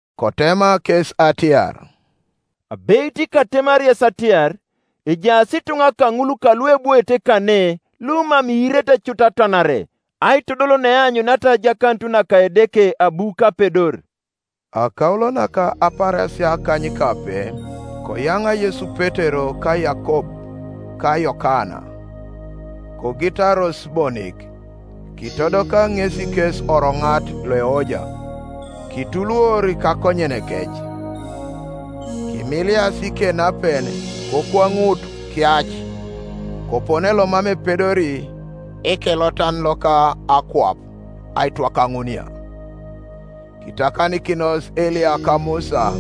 Kotema kes atiar, “Abeit katemari yes atiar, ejaas ituŋa kaŋul kaluebwoete kane lumam iirete cut atwanare, aitodol neaanyuniata ajakanut naka Edeke abu kapedor.” Akaulo naka apaarasia akanykape koyaŋa Yesu Petero ka Yakob ka Yokana, kogitaros bonik, kitodoka ŋesi kes oroŋat loeoja; kituluor kakonyenekec, kimilias ikenapen, kokwanut kiac, kopone lomam epedori ekelotan loka akwap aitwakaŋuunia. Kitakanikinos Eliya ka Musa,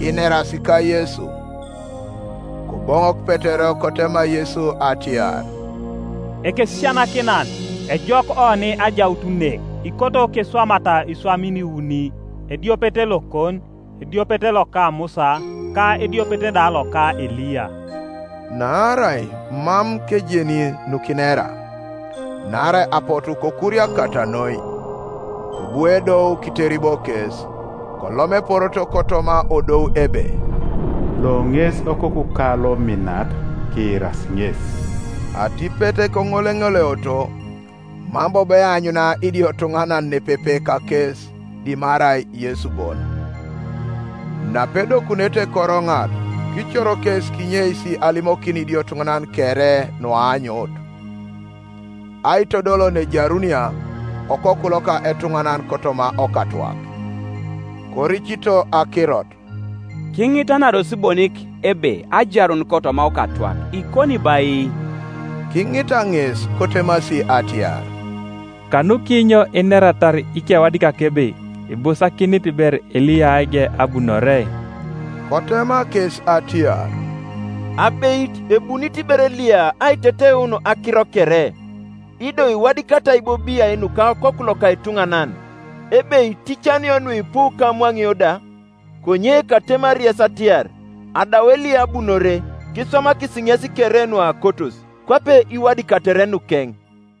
inerasi ka Yesu. Koboŋok Petero kotema Yesu atiar, “Ekesisianakinan, ejok oni ajaut ne; ikoto keswamata iswamin iuni, ediopet lokon, ediopet loka Musa, ka ediopet da loka Eliya.” Naarai mam kejeni nukinera, naarai apotu kokuriakata noi. Kobu edou kiteribo kes, kolom epororo kotoma odou ebe, “Lo ŋes Okokuka lominat; kiirasi ŋes.” Atipet koŋoleŋoleoto, mam bobo eanyuna idiotuŋanan nepepe kakes dimarai Yesu bon. Napedokunete koroŋat, kicor kes kinyeis alimokin idiotuŋanan kere nuaanyut, aitodol naejarunia Okoku loka etuŋanan kotoma okatwak, Koricito akirot, kiŋitanaros bonik ebe ajarun kotoma okatwak ikoni bo ai? Kiŋita ŋes, kotemasi atiar, “Kanukinyo ineratar ikewadikak ebe ibusakinit ber Eliya aige abunore?” Kotema kes atiar, “Abeit ebunit ber Eliya aiteteun akiro kere; ido iwadikatai bo biai nuka Okoku loka etuŋanan, ebe iticanio nuipu ka amwaŋio da? Konye katemari yes atiar, Adau Eliya abunore, kiswamakis ŋes kere nuakotos, kwape Iwadikatere nukeŋ.”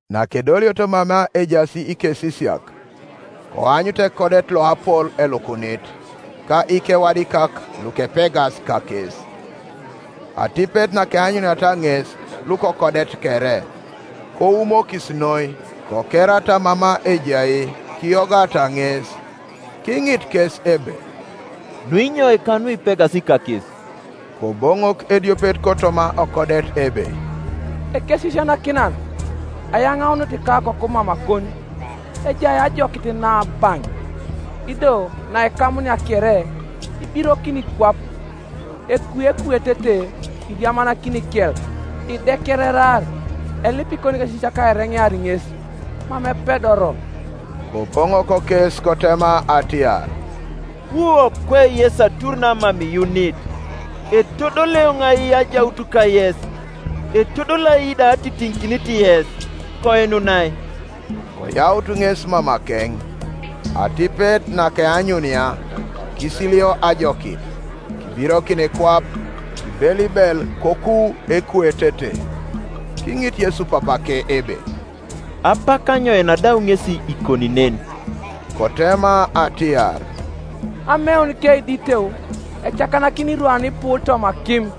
Nakedolioto mama ejaas ikesisiak, koanyut ekodet loapol elukunit, ka ikewadikak lukepegas kakes. Atipet nakeanyuniata ŋes lukokodet kere, koumokis noi, kokerata mama ejai kiyogata ŋes. Kiŋit kes ebe, “Nunyoika nuipegas kakes?” Koboŋok ediopet kotoma okodet ebe, “Ekesisianakinan, ayaŋaunit ikakoku mamakon, ejai ajokit naabaŋ; ido naikamunia kere, ibirokini kwap: ekui ekuetete, iriamanakin ikel, idekererar; elip ikonikesisiak aireŋear ŋes; mam epedoro.” Koboŋok kes kotema atiar, “Wu okwe yes atur namam iyuunit, etodoli eoŋ ai ajaut kayes? Etodoli ai da atitiŋikinit yes? Koinunai.” Koyaut ŋes mamakeŋ; atipet nakeanyunia kisiilio ajokit; kibirokin kwap, kibelibel koku ekuetete. Kiŋit Yesu papake ebe, “Apak anyoin adau ŋesi ikoni nen?” Kotema atiar, “Ameuni keiditeu. Ecakanakini irwanipu toma akim,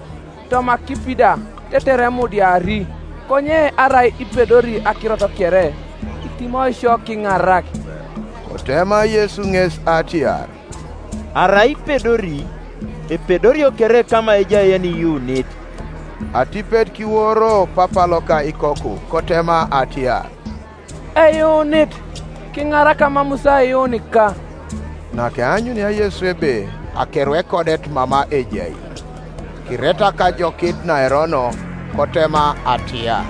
toma akipi da, tetere emudiari: konye arai ipedori akirot kere, kitimoi sio, kiŋarak.” Kotema Yesu ŋes atiar, “Arai ipedori! Epedorio kere kama ejai yeniyuunit.” Atipet kiworo papa loka ikoku kotema atiar, “Eyuunit; kiŋarak amamus aiyuunika.” Nakeanyunia Yesu ebe akeru ekodet mama ejai, kiretak ajokit naerono, kotema atiar,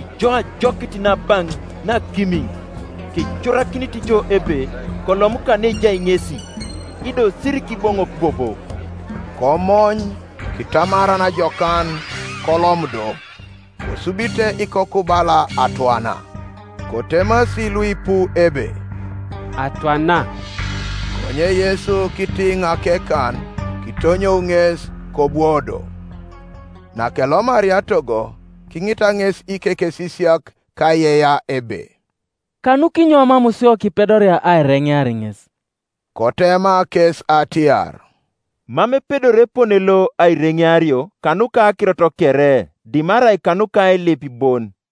“Ijo ajokit naabaŋ naakimiŋ, kecorakinit jo ebe kolom kaneejai ŋesi, ido sirikiboŋok bobo.” Komony, kitamaran jokan, kolom do: kosubite ikoku bala atwana; kotemasi luipu ebe, “Atwana.” Konye Yesu kitiŋ akekan, kitonyou ŋes; kobwo do. Nakelomaria togo, kiŋita ŋes ikekesisiak kaiyeiyea ebe, “Kanukinyo mam sio kipedoria aireŋear ŋes?” Kotema kes atiar, “Mam epedori epone lo aireŋeario kanuka akirot kere dimarai kanuka ailip bon.”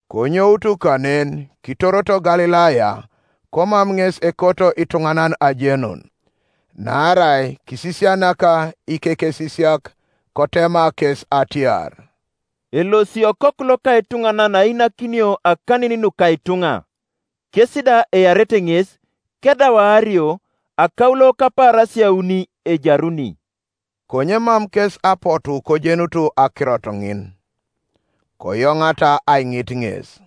Konyoutu kanen kitoroto Galilaya: komam ŋes ekoto ituŋanan ajenun. Naarai kisisianak ikekesisiak, kotema kes atiar, “Elosi Okoku loka etuŋanan ainakinio akanin nuka ituŋa, kes da earete ŋes; kedau aario, akaulo kapaarasia auni ejaruni.” Konye mam kes apotu kojenut akirot ŋin, koyoŋata aiŋit ŋes.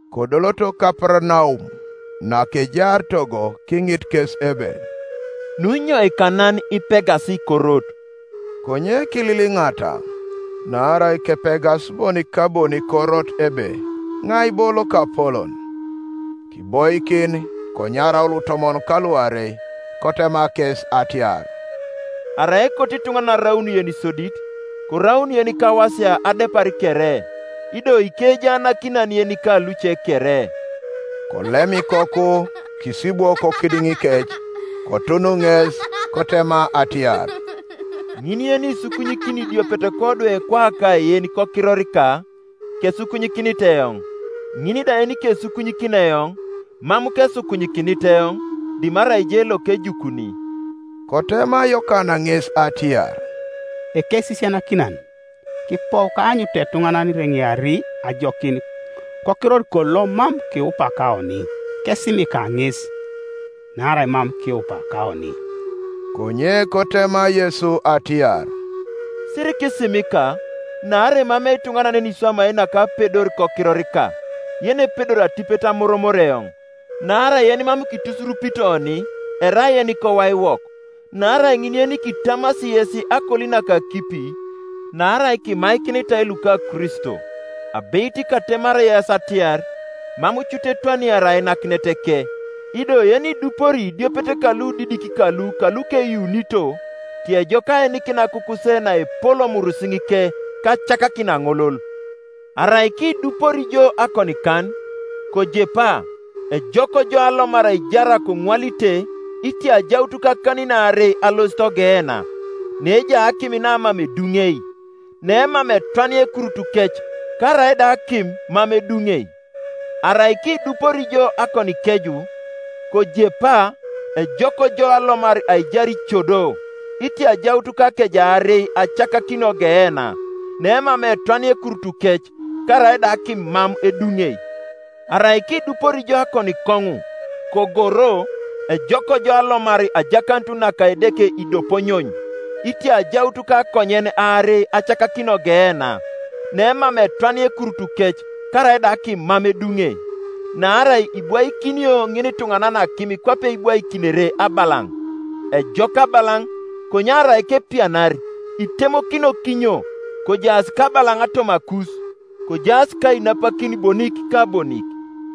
Kodoloto Kaparanaum: nakejaar togo kiŋit kes ebe, “Nuunyoika nan ipegas korot?” Konye kililiŋata: naarai kepegas bonik ka bonik korot ebe iŋai bo lokapolon. Kiboikin, konyarau lutomon kaluarei kotema kes atiar, “Arai ekoto ituŋanan araun yenisodit, koraun yenikawasia adepar kere, ido ikejaanakinan yenika luce kere.” Kolem ikoku, kisibwo kokidiŋikec: kotun ŋes, kotema atiar, “Ŋin yenisukunyikini idiopet kodwe kwaka yen kokirorika, kesukunyikinit eoŋ; ŋin da yenikesukunyikini eoŋ, mam kesukunyikinit eoŋ, dimarai je lokejukuni.” Kotema Yokana ŋes atiar, “Ekesisianakinan, kipou kaanyutu etuŋanan ireŋeari ajokin kokirorikon lomam kiupa kaoni: kesimika ŋes, naarai mam kiupa kaoni.” Konye kotema Yesu atiar, “Sirikisimika: naarai emamei ituŋanan yeniswamai nakapedor kokirorika, yenepedori atipet amoromor eoŋ. Naarai yenimam kitusurupit oni, erai yenikowaiwok. Naarai ŋin yenikitamasi yes akoli naka akipi, naarai kimaikinitai luka Kristo, abeit katemari yes atiar, Mam cut etwaniari ainak ineteke. “Ido yenidupori idiopet ka ludidik kalu kalukeyuunito, tiejok aenikin akukuse naepol omurisiŋike, ka acakakin aŋolol. Arai kidupori jo akonikan, kojepa; ejok jo alomar aijar koŋwalite itia ajaut kak anin aarei alosit ogeena, neejai akim namam eduŋei. [ Nemam etwania ekurutukec, karaida akim mam eduŋei.] Arai kidupori jo akonikeju, kojepa; ejok jo alomar aijar icedo, itia ajaut kakeje aarei acakakinio ogeena. [ Nemam etwania ekurutukec, karaida akim mam eduŋei.] Arai kidupori jo akonikoŋu, kogoro: ejok jo alomar ajakanut naka Edeke idoponyony, itia ajaut kakonyen aarei acakakinio ogeena; nemam etwania ekurutukec, karaida akim mam eduŋei. Naarai ibwaikinio ŋinituŋanan akim kwape ibwaikinere abalaŋ. Ejok abalaŋ; konye arai kepianiar, itemokinio kinyo? Kojaas kabalaŋ tomakus, kojaas kainapakin bonik ka bonik.”